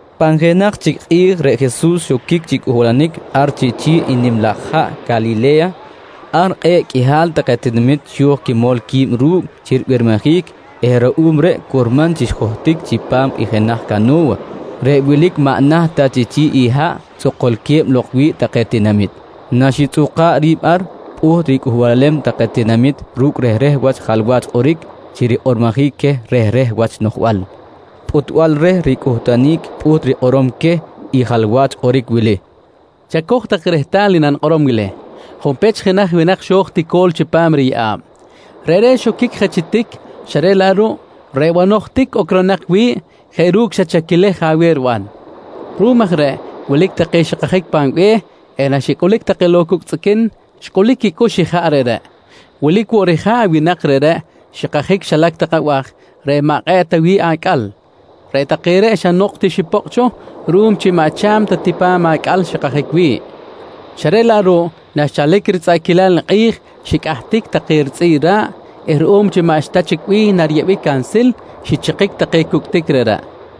Pan jenaj chic kꞌi̱j reꞌ Jesus xoquic chi cꞌuhbalanic ar chi chi̱ꞌ i nim laj haꞌ Calile̱ya. Ar kꞌe̱ꞌ qꞌuihal take tinamit xo̱j quimol qui̱b ru̱cꞌ chi ribirmijic eh ruꞌum reꞌ curman chi xjohtic chipam i jenaj cano̱wa reꞌ wilic maꞌ naht ta chi chi̱ꞌ i haꞌ tzokolque̱b lok wi̱ꞌ take tinamit. Naxitzꞌuka̱ꞌ ri̱b ar, pꞌuht ricꞌuhbalem take tinamit ru̱cꞌ rehreh wach jalwach kꞌoric chi rikꞌormojic queh rehreh wach noꞌjbal. Pꞌutbal reh ricꞌuhtunic pꞌuht rikꞌorom queh i jalwach kꞌoric wili: «Chacoj tak rehtal i nanikꞌorom wili: Junpech jenaj winak xo̱j tico̱l chipam riyeꞌa̱b. Reꞌreꞌ xoquic je chi tic xa reꞌ laꞌ ruꞌ reꞌ banoj tic ocronak wi̱ꞌ jeꞌ ru̱cꞌ xa chaquilej je aweh riban. Ruꞌum aj reꞌ wilic take xikajic pan be̱h eh naxicꞌulic lok take cucꞌ tzꞌiquin xcꞌulic quicꞌux ijaꞌ reꞌreꞌ. Wilic woꞌ rija̱ꞌ i winak reꞌreꞌ xikajic xilac tak abaj reꞌ maꞌ kꞌe̱ꞌ ta wi̱ꞌ acꞌal. Reꞌ take reꞌ xa nok woꞌ ti xipokꞌ cho ruꞌum chi maꞌ cha̱m ta ti pa̱m acꞌal xikajic wi̱ꞌ, xa reꞌ laꞌ ruꞌ naxchalic ritzꞌaꞌquilal i kꞌi̱j xicꞌahtic take ritzꞌi̱ꞌ ra̱ꞌ eh ruꞌum chi maꞌxta chic bih nariyeꞌbic cansil, xichikic take cucꞌ tic reꞌreꞌ.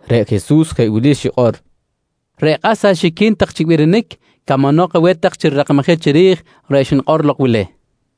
reꞌ Jesus jeꞌ wili xikꞌor: «Reꞌ kꞌas axiquin tak chi birinic camanok aweh tak chi rirakmajic chiri̱j reꞌ xnikꞌor lok wili, nqui xikꞌor.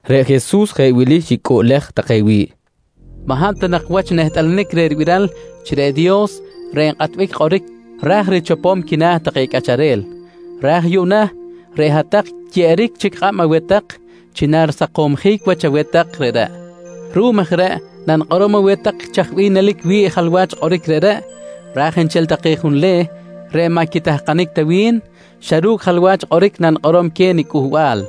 Reꞌ Jesus jeꞌ wili xicꞌuꞌlej take wi̱ꞌ: «Maꞌ hab ta nak wach nehtꞌalanic reh ribiral chi reꞌ Dios reꞌ nkꞌatbic kꞌoric ra̱j richopom quina̱ take cꞌacharel, raj yuꞌna reꞌ hat-tak xyeꞌeric chic kꞌab aweh tak chi narisakomjic wach aweh tak reꞌreꞌ. Ruꞌum aj reꞌ nanikꞌorom aweh tak chaj bih nelic wi̱ꞌ i jalwach kꞌoric reꞌreꞌ raj nchel take junleh reꞌ maꞌ quitahkanic ta wi̱n, xa ru̱cꞌ jalwach kꞌoric nanikꞌorom queh niCꞌuhbal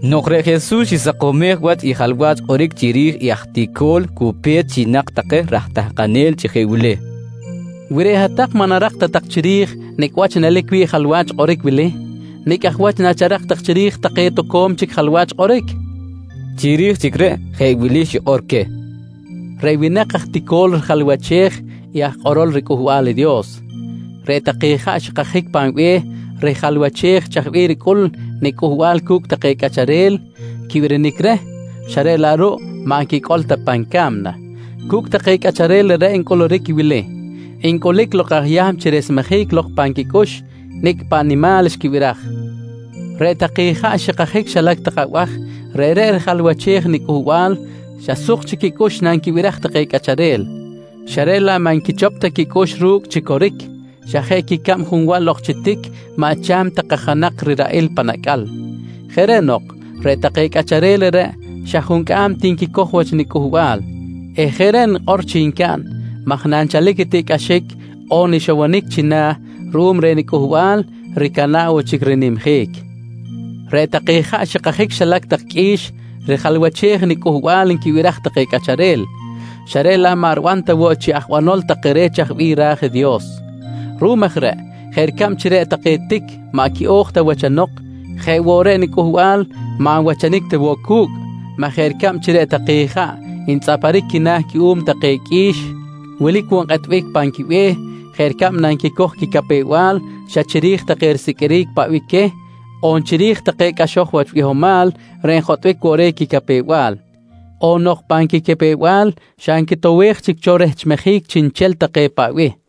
Nok reꞌ Jesus xisakomej wach i jalwach kꞌoric chiri̱j i aj tico̱l cu pe̱t xinak take raj tahkanel chi jeꞌ wili: «Wi reꞌ hat-tak maꞌ narak ta tak chiri̱j nicꞌ wach nelic wi̱ꞌ i jalwach kꞌoric wili, nicꞌ aj wach nacharak tak chiri̱j take toco̱m chic jalwach kꞌoric? nqui queh. Chiri̱j chic reꞌ, jeꞌ wili xikꞌor queh: «Reꞌ winak aj tico̱l rijalwachej i aj kꞌorol riCꞌuhbal i Dios. Reꞌ take ijaꞌ xkajic pan be̱h rijalwachej chaj bih ricꞌul i niCꞌuhbal cu̱cꞌ take cꞌacharel quibirinic reh xa reꞌ laꞌ ruꞌ maꞌ nquicꞌol ta pan ca̱mna. Cu̱cꞌ take cꞌacharel reꞌreꞌ ncꞌuluric i wili: Ncꞌulic lok i aj Yahm chi resmejic lok pan quicꞌux i nicꞌ paꞌ nimal xquibiraj. «Reꞌ take ijaꞌ xikajic xilac tak abaj reꞌreꞌ rijalwachej i niCꞌuhbal xa suk chic quicꞌux nanquibiraj take cꞌacharel, xa reꞌ laꞌ maꞌ nquichop ta quicꞌux ru̱cꞌ chi coric, xa jeꞌ quicab junwal ok chi tic maꞌ cha̱m ta kajanak riraꞌil pan acꞌal. Jeꞌ reꞌ nok, reꞌ take cꞌacharel reꞌreꞌ xa juncꞌam ti nquicoj wach niCꞌuhbal eh jeꞌ reꞌ nikꞌor chi ncaꞌn maj nanchalic i tiꞌcꞌaxic on ixowonic china̱ ruꞌum reh niCꞌuhbal ricana̱ꞌ woꞌ chic rinimjic. «Reꞌ take ijaꞌ xikajic xilac tak qꞌui̱x rijalwachej i niCꞌuhbal nquibiraj take cꞌacharel, xa reꞌ laꞌ maꞌ riban ta woꞌ chi aj banol take reh chaj bih ra̱j i Dios. Ruꞌum aj reꞌ jeꞌ ricab chi reꞌ take tic maꞌ quiꞌo̱j ta wachanok jeꞌ woꞌ reꞌ i niCꞌuhbal, maꞌ nwachanic ta woꞌ cu̱cꞌ maj jeꞌ ricab chi reꞌ take ijaꞌ ntzꞌaparic quina̱ cuꞌum take qꞌui̱x, wilic woꞌ nkꞌetbic pan quibe̱h jeꞌ ricab nanquicoj quicapew-bal xa chiri̱j take risiqꞌuiric paꞌ bih queh on chiri̱j take cꞌaxoj wach bihomal reꞌ njotꞌbic woꞌ reh quicapew-bal, on nok pan quicapew-bal xa ncotowej chic cho rehchmejic chiꞌnchel take paꞌ bih.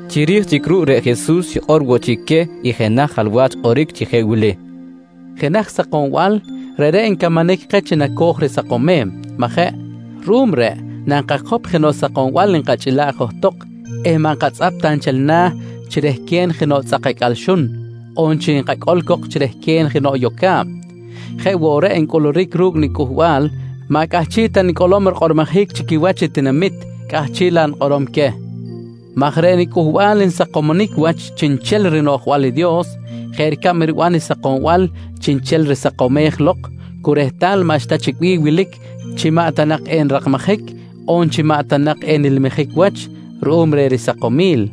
Chiri̱j chic ruꞌ reꞌ Jesus xikꞌor woꞌ chic queh i jenaj jalwach kꞌoric chi jeꞌ wili: «Jenaj sakombal, reꞌreꞌ ncamanic keh chi naco̱j risakomem, majeꞌ? Ruꞌum reꞌ nankakop jenoꞌ sakombal nkachꞌila̱ꞌ johtok eh maꞌ nkatzꞌap ta nchel na̱ chi rehquen jenoꞌ tzꞌak acꞌal xun on chi enkacꞌol cok chi rehquen jenoꞌ yoca̱b. Jeꞌ woꞌ reꞌ ncꞌuluric ru̱cꞌ niCꞌuhbal maꞌ cꞌahchiꞌ ta nicꞌolom rikꞌormojic chi quiwach i tinamit, cꞌahchiꞌ laꞌ nikꞌorom queh maj reꞌ niCꞌuhbal nsakomsonic wach chiꞌnchel rinoꞌjbal i Dios jeꞌ ricab riban i sakombal chiꞌnchel risakomej lok cu rehtal maꞌxta chic bih wilic chi maꞌ ta nak enrakmajic on chi maꞌ ta nak enilmijic wach ruꞌum reh risakomil.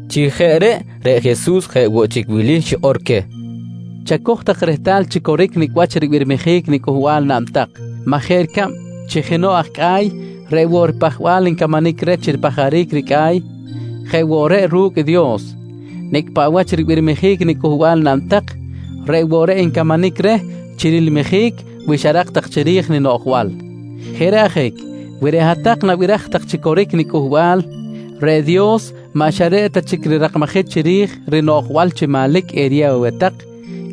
Chi jeꞌ reꞌ, reꞌ Jesus jeꞌ woꞌ chic wili xikꞌor queh: «Chacoj tak rehtal chi coric nicꞌ wach ribirmijic niCꞌuhbal naꞌn tak maj jeꞌ ricab chi jenoꞌ aj cꞌa̱y, reꞌ woꞌ i ripajbal ncamanic reh chi ripajaric i ricꞌa̱y, jeꞌ woꞌ reꞌ ru̱cꞌ i Dios. Nicꞌ paꞌ wach ribirmijic niCꞌuhbal naꞌn tak, reꞌ woꞌ reꞌ encamanic reh chi rilmijic wi xarak tak chiri̱j ninoꞌjbal. Jeꞌ reꞌ ajic wi reꞌ hat-tak nabiraj tak chi coric niCꞌuhbal, reꞌ Dios maꞌ xa reꞌ ta chic rirakmajic chiri̱j rinoꞌjbal chi manlic eriyew aweh tak,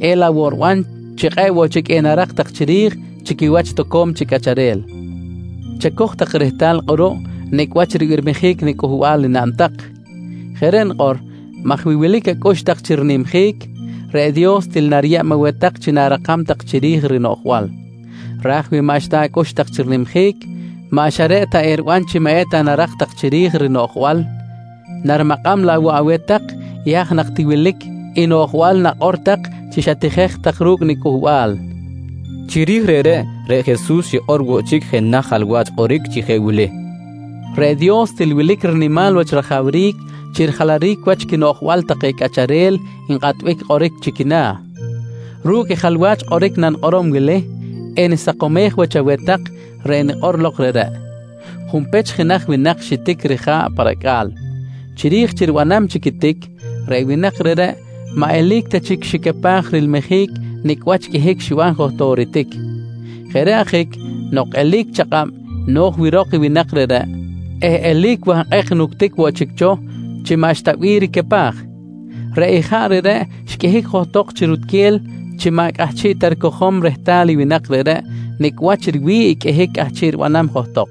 elaꞌ woꞌ riban chi kꞌe̱ꞌ woꞌ chic enarak tak chiri̱j chi quiwach toco̱m chic cꞌacharel. Chacoj tak rehtal kꞌuruꞌ nicꞌ wach ribirmijic niCꞌuhbal enaꞌn tak. Jeꞌ reꞌ nikꞌor maj wi wilic acꞌux tak chi rinimjic, reꞌ Dios til nariyeb aweh tak chi na̱rakam tak chiri̱j rinoꞌjbal. Raj wi maꞌxta acꞌux tak chi rinimjic, maꞌ xa reꞌ ta eriban chi maꞌ eta narak tak chiri̱j rinoꞌjbal, narimakꞌam laꞌ woꞌ aweh tak i haj nak ti wilic i noꞌjbal nakꞌor tak chi xatijej tak ru̱cꞌ niCꞌuhbal, nqui Jesus. Chiri̱j reꞌreꞌ, reꞌ Jesus xikꞌor woꞌ chic jenaj jalwach kꞌoric chi jeꞌ wili: «Reꞌ Dios, til wilic rinimal wach rajawric chi rijalaric wach quinoꞌjbal take cꞌacharel nkꞌatbic kꞌoric chi quina̱. Ru̱cꞌ i jalwach kꞌoric nanikꞌorom wili enisakomej wach aweh tak reꞌ xnikꞌor lok reꞌreꞌ. Junpech jenaj winak xitic rija̱ꞌ pa racꞌa̱l. Chiri̱j chi ribanam chic i tic, reꞌ winak reꞌreꞌ maꞌ eli̱c ta chic xicapaj rilmijic nicꞌ wach qꞌuihic xiban johtok i ritic. Jeꞌ reꞌ ajic nok eli̱c chakꞌab no̱j wirok i winak reꞌreꞌ eh eli̱c wahkꞌek nuctic woꞌ chic cho chi maꞌxta bih ricapaj, reꞌ ijaꞌ reꞌreꞌ xqꞌuihic johtok chi rutquel chi maꞌ cꞌahchiꞌ ta ricojom rehtal i winak reꞌreꞌ nicꞌ wach riwi̱ꞌ i qꞌuihic cꞌahchiꞌ ribanam johtok.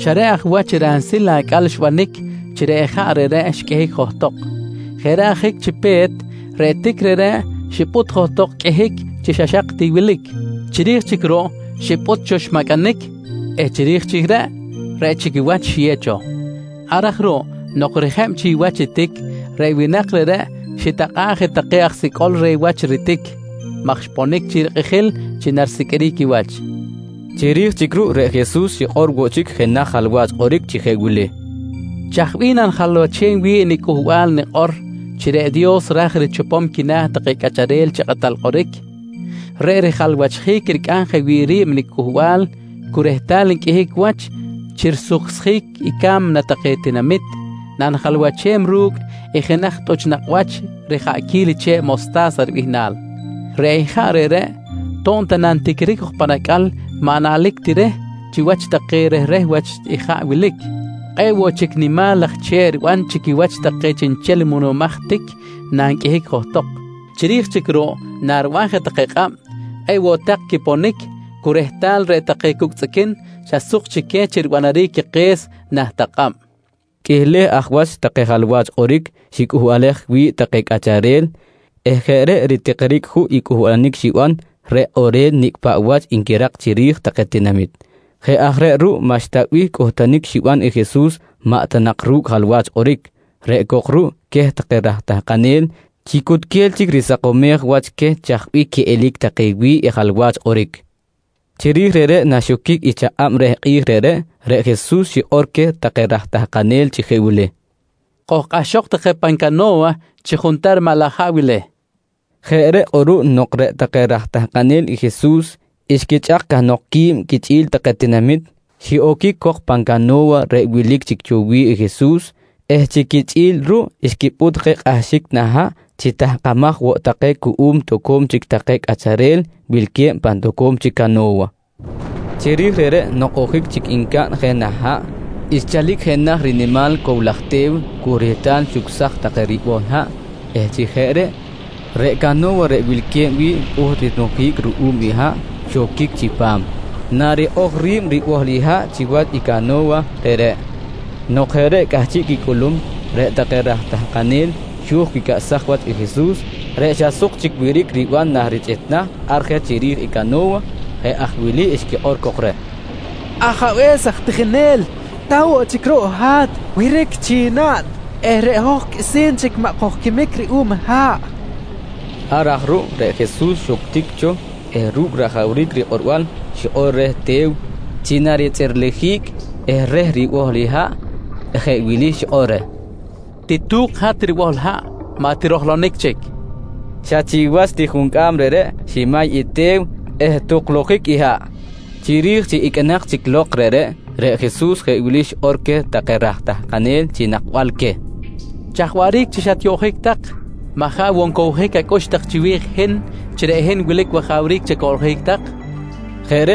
Xa reꞌ aj wach ransil i acꞌal xbanic chi reꞌ ijaꞌ reꞌreꞌ xqꞌuihic johtok. Jeꞌ reꞌ ajic chi pe̱t, reꞌ tic reꞌreꞌ xipꞌut johtok qꞌuihic chi xa xak ti wilic. Chiri̱j chic ruꞌ xipꞌut cho xmacꞌanic eh chiri̱j chic reꞌ, reꞌ chic i wach xiyew cho. Ar aj ruꞌ nok rijeb chic wach i tic, reꞌ winak reꞌreꞌ xitakꞌa̱ꞌ take aj sicꞌol reh wach i ritic maj xponic chic rikꞌijil chi narisiqꞌuiric i wach, nqui Jesus. Chiri̱j chic ruꞌ reꞌ Jesus xikꞌor woꞌ chic jenaj jalwach kꞌoric chi jeꞌ wili: «Chaj bih nanijalwachem wi̱ꞌ i niCꞌuhbal nikꞌor chi reꞌ Dios ra̱j richopom quina̱ take cꞌacharel chi kꞌatal kꞌoric? Reꞌ rijalwachjic i ricꞌam jeꞌ wi̱ꞌ ri̱b niCꞌuhbal cu rehtal nqꞌuihic wach chi risuksjic i ca̱mna take tinamit nanijalwachem i jenaj tꞌuch nakꞌ wach rijaꞌquil i che̱ꞌ mosta̱sa ribihnal. Reꞌ ijaꞌ reꞌreꞌ to̱b ta nantiquiric jok pan acꞌal maꞌ naꞌlic ti reh chiwach take rehreh wach ijaꞌ wilic, kꞌe̱ꞌ woꞌ chic nimal laj che̱ꞌ riban chi quiwach take chiꞌnchel muꞌunumaj tic nanqꞌuihic johtok. Chiri̱j chic ruꞌ nariban je take kꞌab, kꞌe̱ꞌ woꞌ tak quiponic cu rehtal reꞌ take cucꞌ tzꞌiquin xa suk chic queh chi ribanaric quike̱s nah tak kꞌab, nqui Jesus. Qꞌuihleh aj wach take jalwach kꞌoric xicꞌuhbalej wi̱ꞌ take cꞌacharel eh jeꞌ reꞌ ritikiric juꞌ cꞌuhbalanic xiban reꞌ kꞌorel nicꞌ paꞌ wach nquirak chiri̱j take tinamit. Jeꞌ aj reꞌ ruꞌ maꞌxta bih cꞌuhtunic xiban i Jesus maꞌ ta nak ru̱cꞌ jalwach kꞌoric, reꞌ cok ruꞌ queh take raj tahkanel chi cutquel chic risakomej wach queh chaj bih quiꞌelic take wi̱ꞌ i jalwach kꞌoric. Chiri̱j reꞌreꞌ naxoquic i chakꞌab reh kꞌi̱j reꞌreꞌ, reꞌ Jesus xikꞌor queh take raj tahkanel chi jeꞌ wili: «Kojkꞌahxok tak je pan cano̱wa chi juntar maꞌ laj haꞌ wili, nqui queh. Jeꞌ reꞌ kꞌuruꞌ nok reꞌ take raj tahkanel i Jesus xquichꞌak cahnok qui̱b quichꞌi̱l take tinamit, xiꞌoquic cok pan cano̱wa reꞌ wilic chic cho wi̱ꞌ i Jesus eh chi quichꞌi̱l ruꞌ xquipꞌut je kꞌahxic nah haꞌ chi tahkamaj woꞌ take cuꞌum toco̱m chic take cꞌacharel wilque̱b pan toco̱m chic cano̱wa. Chiri̱j reꞌreꞌ nok ojic chic ncaꞌn je nah haꞌ, xchalic jenaj rinimal cow laj te̱w cu rehtal xucsaj take ribohl haꞌ eh chi jeꞌ reꞌ, reꞌ cano̱wa reꞌ wilque̱b wi̱ꞌ pꞌuht rinujic ruꞌum i haꞌ xoquic chipam narikꞌoj ri̱b ribohl i haꞌ chiwach i cano̱wa reꞌreꞌ. Nok jeꞌ reꞌ cꞌahchiꞌ quicꞌulum, reꞌ take raj tahkanel xo̱j quicꞌaꞌsaj wach i Jesus reꞌ xa suk chic wiric riban nah richꞌitnah ar je chiri̱j i cano̱wa. Jeꞌ aj wili xquikꞌor cok reh: «Ajabe̱s aj tijinel! Ta woꞌ chic ruꞌ i hat! Wiric chic naꞌn eh reꞌ hoj qꞌuisi̱n chic maꞌ kojquimic ruꞌum i haꞌ, nqui take reh. Ar aj ruꞌ, reꞌ Jesus xuctic cho eh ru̱cꞌ rajawric rikꞌorbal xikꞌor reh te̱w chi naritzꞌirlijic eh reh ribohl i haꞌ jeꞌ wili xikꞌor reh: «Titu̱k hat ribohl haꞌ, maꞌ tirojlonic chic! nqui xikꞌor. Xa chiwach ti juncꞌam reꞌreꞌ ximay i te̱w eh tuklujic i haꞌ. Chiri̱j chi iqꞌuinak chic lok reꞌreꞌ, reꞌ Jesus jeꞌ wili xikꞌor queh take raj tahkanel chi nakbal queh: «Chaj waꞌric chi xatyoꞌjic tak? Maꞌ jaꞌ woꞌ ncowjic ta acꞌux tak chiwi̱j i hin chi reꞌ hin wilic wajawric chi acoꞌljic tak? nqui queh.